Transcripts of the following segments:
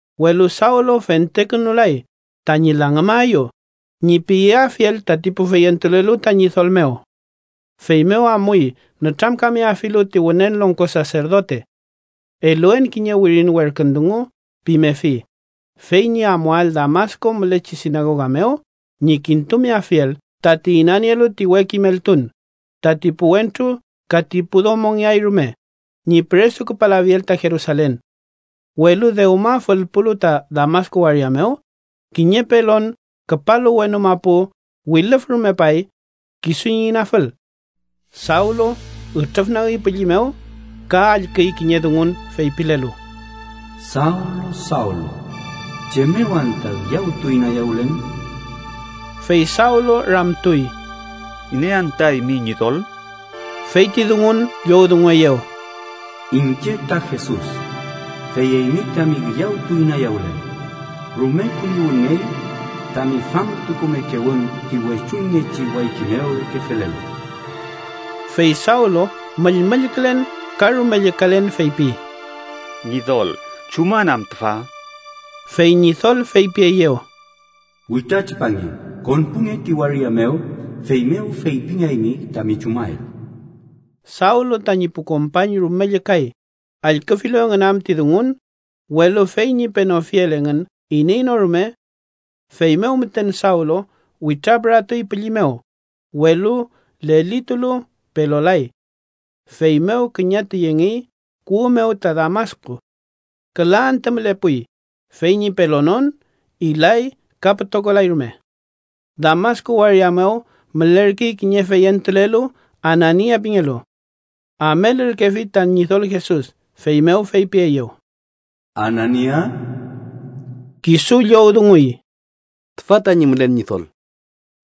Welu Sawlu fentekünulay tañi “langümaeyu” ñi piyeafiel tati pu feyentulelu ta Ñidol mew. Feymew amuy nütramkameafilu ti Wünen Longko Saserdote. “Eluen kiñe wirin werkün dungu” pimefi, fey ñi amuael Damasku mülechi sinagoga mew ñi kintumeafiel tati inanielu ti we kimeltun, tati pu wentru ka ti pu domongeay rume, ñi püresuküpalafiel ta Jerusalen. Welu dewma fülpulu ta Damasku waria mew, kiñe pelon küpalu wenu mapu wilüfrumepay kisu ñi inafül. Sawlu ütrüfnagi pülli mew, ka allküy kiñe dungun feypilelu: —Sawlu, Sawlu, ¿chem mew anta üyawtu inayawülen? Fey Sawlu ramtuy: —¿Iney am ta, eymi Ñidol? Fey ti dungun llowdungueyew: —Iñche ta Jesus, fey eymi tami üyawtu inayawülel. Rume kuñiwünngey tami famtukumekewün ti wechuñngechi wayki mew reke felelu. Fey Sawlu müllmüllkülen ka rume llükalen feypi: —Ñidol, ¿chuman am tüfa? Fey Ñidol feypieyew: —Witratripange. Konpunge ti waria mew, feymew feypingeaymi tami chumael. Sawlu tañi pu kompañ rume llükay, allküfilu engün am ti dungun, welu fey ñi penofiel engün iney no rume. Feymew müten Sawlu witrapüratuy pülli mew, welu lelitulu, pelolay. Feymew küñatu yengey kuwü mew ta Damasku. Küla antü mülepuy fey ñi pelonon. Ilay ka pütokolay rume. Damasku waria mew mülerkey kiñe feyentulelu Anania pingelu. Amelürkefi ta Ñidol Jesus, feymew feypieyew: —¡Anania! Kisu llowdunguy: —Tüfa tañi mülen, Ñidol.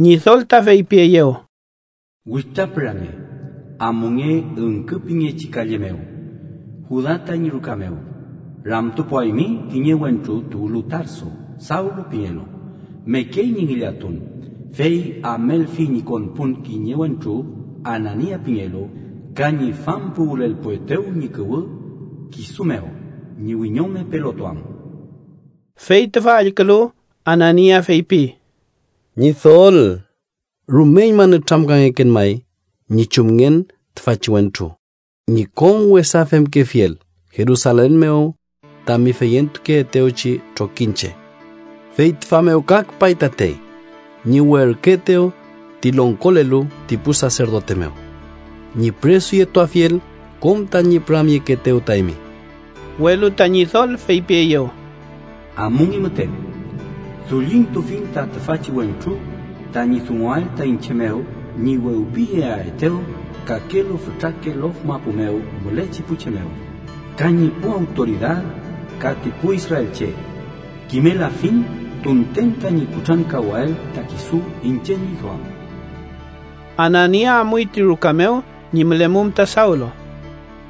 Ñidol ta feypieyew: —Witrapürange. Amunge Üngkü pingechi kalle mew, Juda tañi ruka mew. Ramtupuaymi kiñe wentru tuwlu Tarso, Sawlu pingelu. Mekey ñi ngillatun. Fey amelfi ñi konpun kiñe wentru Anania pingelu ka ñi fampuwülelpuetew ñi kuwü kisu mew ñi wiñome pelotuam. Fey tüfa allkülu, Anania feypi: —Ñidol rumeñma nütramkangeken may ñi chumngen tüfachi wentru ñi kom wesa femkefiel Jerusalen mew tami feyentukeetewchi trokiñche. Fey tüfa mew ka küpay tatey ñi werküetew ti longkolelu ti pu saserdote mew, ñi püresuyetuafiel kom tañi püramyekeetew ta eymi. Welu ta Ñidol feypieyew: —Amunge müten. Dullintufiñ ta tüfachi wentru tañi dunguael ta iñche mew ñi wewpiyeaetew kakelu fütrake lof mapu mew mülechi pu che mew, ka ñi pu awtoridad, ka ti pu israelche. Kimelafiñ tunten tañi kutrankawael ta kisu iñche ñi duam. Anania amuy ti ruka mew ñi mülemum ta Sawlu.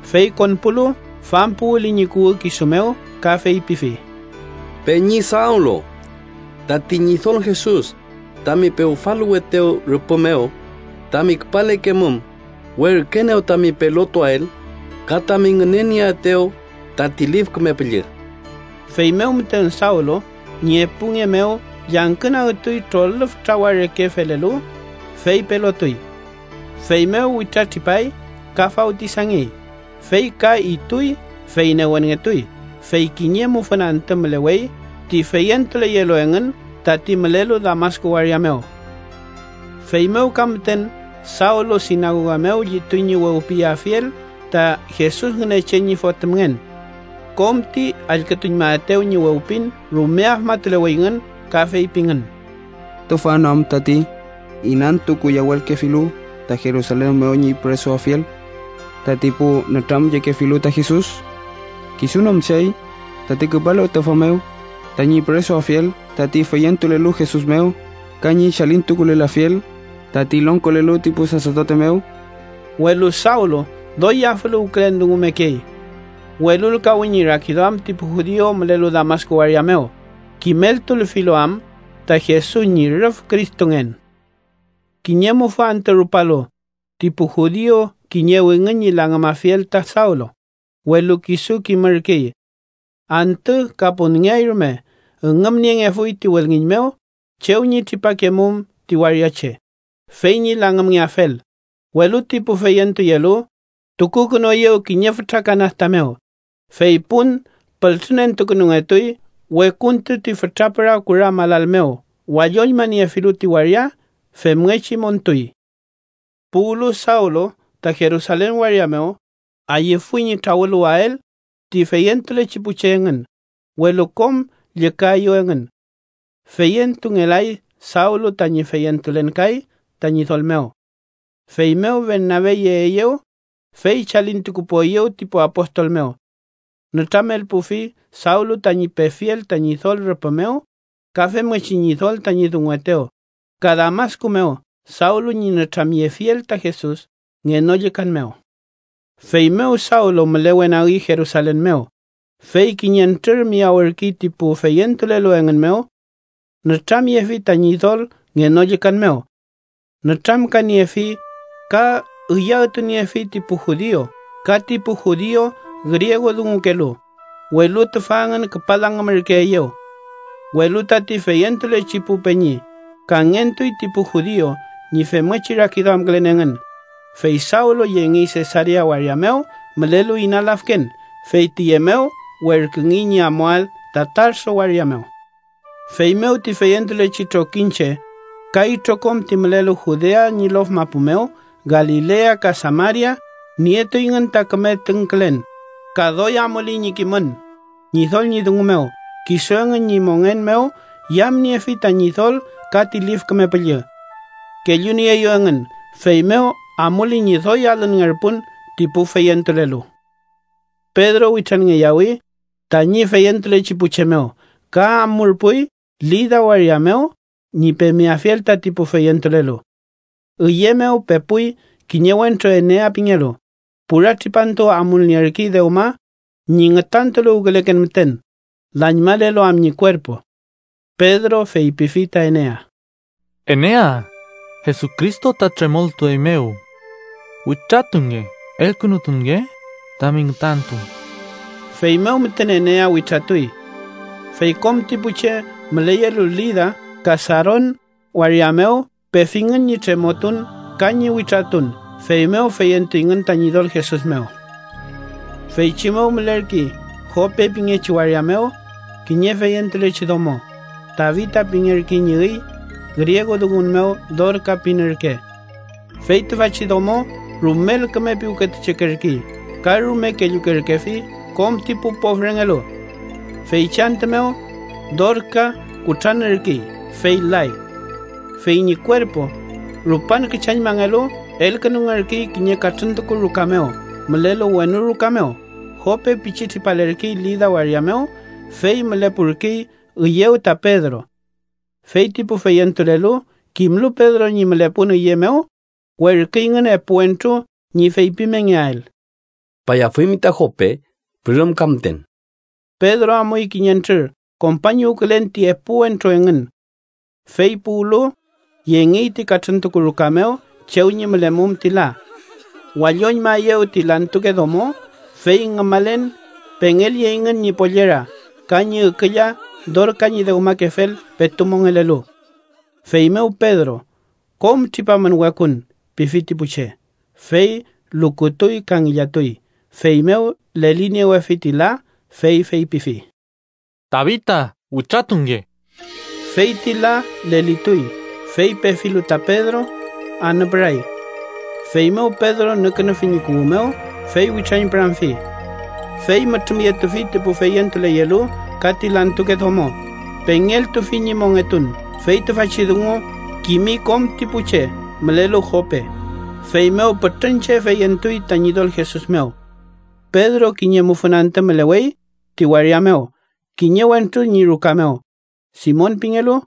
Fey konpulu, fampuwüli ñi kuwü kisu mew ka feypifi: —Peñi Sawlu, tati Ñidol Jesus, tami pewfaluwetew rüpü mew tami küpalekemum, werküenew tami pelotuael ka tami ngünenieetew tati Lif Küme Püllü. Feymew müten Sawlu ñi epu nge mew llangkünagtuy trolüf trawa reke felelu, fey pelotuy. Feymew witratripay ka fawtisangey. Fey ka ituy, fey newenngetuy. Fey kiñe mufün antü mülewey ti feyentuleyelu engün tati mülelu Damasku waria mew. Feymew ka müten Sawlu sinagoga mew llituy ñi wewpiyeafiel ta Jesus Ngünechen ñi Fotümngen. Kom ti allkütuñmaetew ñi wewpin rume afmatuleweyngün ka feypingün: “¿Tüfa no am tati inantukuyawülkefilu ta Jerusalen mew ñi püresuafiel tati pu nütramyekefilu ta Jesus? ¿Kisu no am chey tati küpalu tüfa mew tañi püresuafiel tati feyentulelu Jesus mew ka ñi chalintukulelafiel tati longkolelu ti pu saserdote mew?” Welu Sawlu doy yafüluwkülen dungumekey. Welulkawi ñi rakiduam ti pu judiu mülelu Damasku waria mew, kimeltulfilu am ta Jesus ñi rüf Cristongen. Kiñe mufü antü rupalu, ti pu judiu kiñewingün ñi langümafiel ta Sawlu, welu kisu kimürkey. Antü ka punngeay rume üngümniengefuy ti wülngiñ mew chew ñi tripakemum ti waria che, fey ñi langümngeafel, welu ti pu feyentuyelu tukukünueyew kiñe fütra kanasta mew, fey pun pültrüentukünungetuy wekuntu ti fütrapüra kura malal mew walloñmaniefilu ti waria. Femngechi montuy. Puwlu Sawlu ta Jerusalen waria mew, ayüfuy ñi trawüluwael ti feyentulechi pu che engün, welu kom llükaeyew engün. Feyentungelay Sawlu tañi feyentulen kay ta Ñidol mew. Feymew, Bernabe yeeyew, fey chalintukupueyew ti pu apostol mew. Nütramelpufi Sawlu tañi pefiel ta Ñidol rüpü mew, ka femngechi Ñidol tañi dunguetew, ka Damasku mew Sawlu ñi nütramyefiel ta Jesus ngenollükan mew. Feymew Sawlu mülewenagi Jerusalen mew, fey kiñentrür miyawürkey ti pu feyentulelu engün mew. Nütramyefi ta Ñidol ngenollükan mew. Nütramkaniefi ka üyawtuniefi ti pu judiu ka ti pu judiu griegudungukelu, welu tüfa engün küpa langümürkeeyew. Welu tati feyentulechi pu peñi kangentuy ti pu judiu ñi femngechi rakiduamkülen engün, fey Sawlu yengey Sesarea waria mew mülelu ina lafken. Fey tiye mew werküngey ñi amuael ta Tarso waria mew. Feymew ti feyentulechi trokiñche ka itrokom ti mülelu Judea ñi lof mapu mew, Galilea ka Samaria, nietuyngün ta küme tüngkülen ka doy amuley ñi kimün Ñidol ñi dungu mew. Kisu engün ñi mongen mew yamniefi ta Ñidol ka ti Lif Küme Püllü kellunieeyew engün, feymew amuley ñi doy alünngerpun ti pu feyentulelu. Pedro witranngeyawi tañi feyentulechi pu che mew ka amurpuy Lida waria mew ñi pemeafiel tati pu feyentulelu. Üye mew pepuy kiñe wentru Enea pingelu, pura tripantu amulnierkey dewma ñi ngütantuluwküleken müten, lañmalelu am ñi kuerpu. Pedro feypifi ta Enea: —Enea, Jesucristo ta tremoltueymew. Witratunge. Elkünutunge tami ngütantu. Feymew müten Enea witratuy. Fey kom ti pu che müleyelu Lida ka Saron waria mew pefingün ñi tremotun ka ñi witratun, feymew feyentuyngün ta Ñidol Jesus mew. Feychi mew mülerkey Jope pingechi waria mew, kiñe feyentulechi domo, Tabita pingerkey ñi üy, griegudungun mew Dorka pin ürke. Fey tüfachi domo rumel küme piwketuchekerkey ka rume kellukerkefi kom ti pu pofrengelu. Feychi antü mew, Dorka kutranürkey, fey lay. Fey ñi kuerpu, rupan küchañmangelu, elkünungerkey kiñe katrüntuku ruka mew mülelu wenu ruka mew. Jope pichi tripalerkey Lida waria mew, fey mülepurkey üyew ta Pedro. Fey ti pu feyentulelu, kimlu Pedro ñi mülepun üye mew, werküyngün epu wentru ñi feypimengeael: —Küpayafuymi ta Jope pürümka müten. Pedro amuy kiñentrür kompañuwkülen ti epu wentru engün. Fey puwlu, yengey ti katrüntuku ruka mew chew ñi mülemum ti la. Walloñmaeyew ti lantuke domo, fey ngümalen pengelyeyngün ñi pollera ka ñi ükülla Dorka ñi dewmakefel petu mongelelu. Feymew Pedro “kom tripamün wekun” pifi ti pu che, fey lukutuy ka ngillatuy. Feymew leliniewefi ti la, fey feypifi: —¡Tabita, witratunge! Fey ti la lelituy, fey pefilu ta Pedro, anüpüray. Feymew Pedro nükünufi ñi kuwü mew, fey witrañpüramfi. Fey mütrümyetufi ti pu feyentuleyelu ka ti lantuke domo pengeltufi ñi mongetun. Fey tüfachi dungu kimi kom ti pu che mülelu Jope, feymew pütrün che feyentuy ta Ñidol Jesus mew. Pedro kiñe mufün antü mülewey ti waria mew, kiñe wentru ñi ruka mew, Simon pingelu,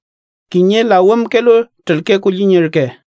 kiñe lawümkelu trülke kulliñ ürke.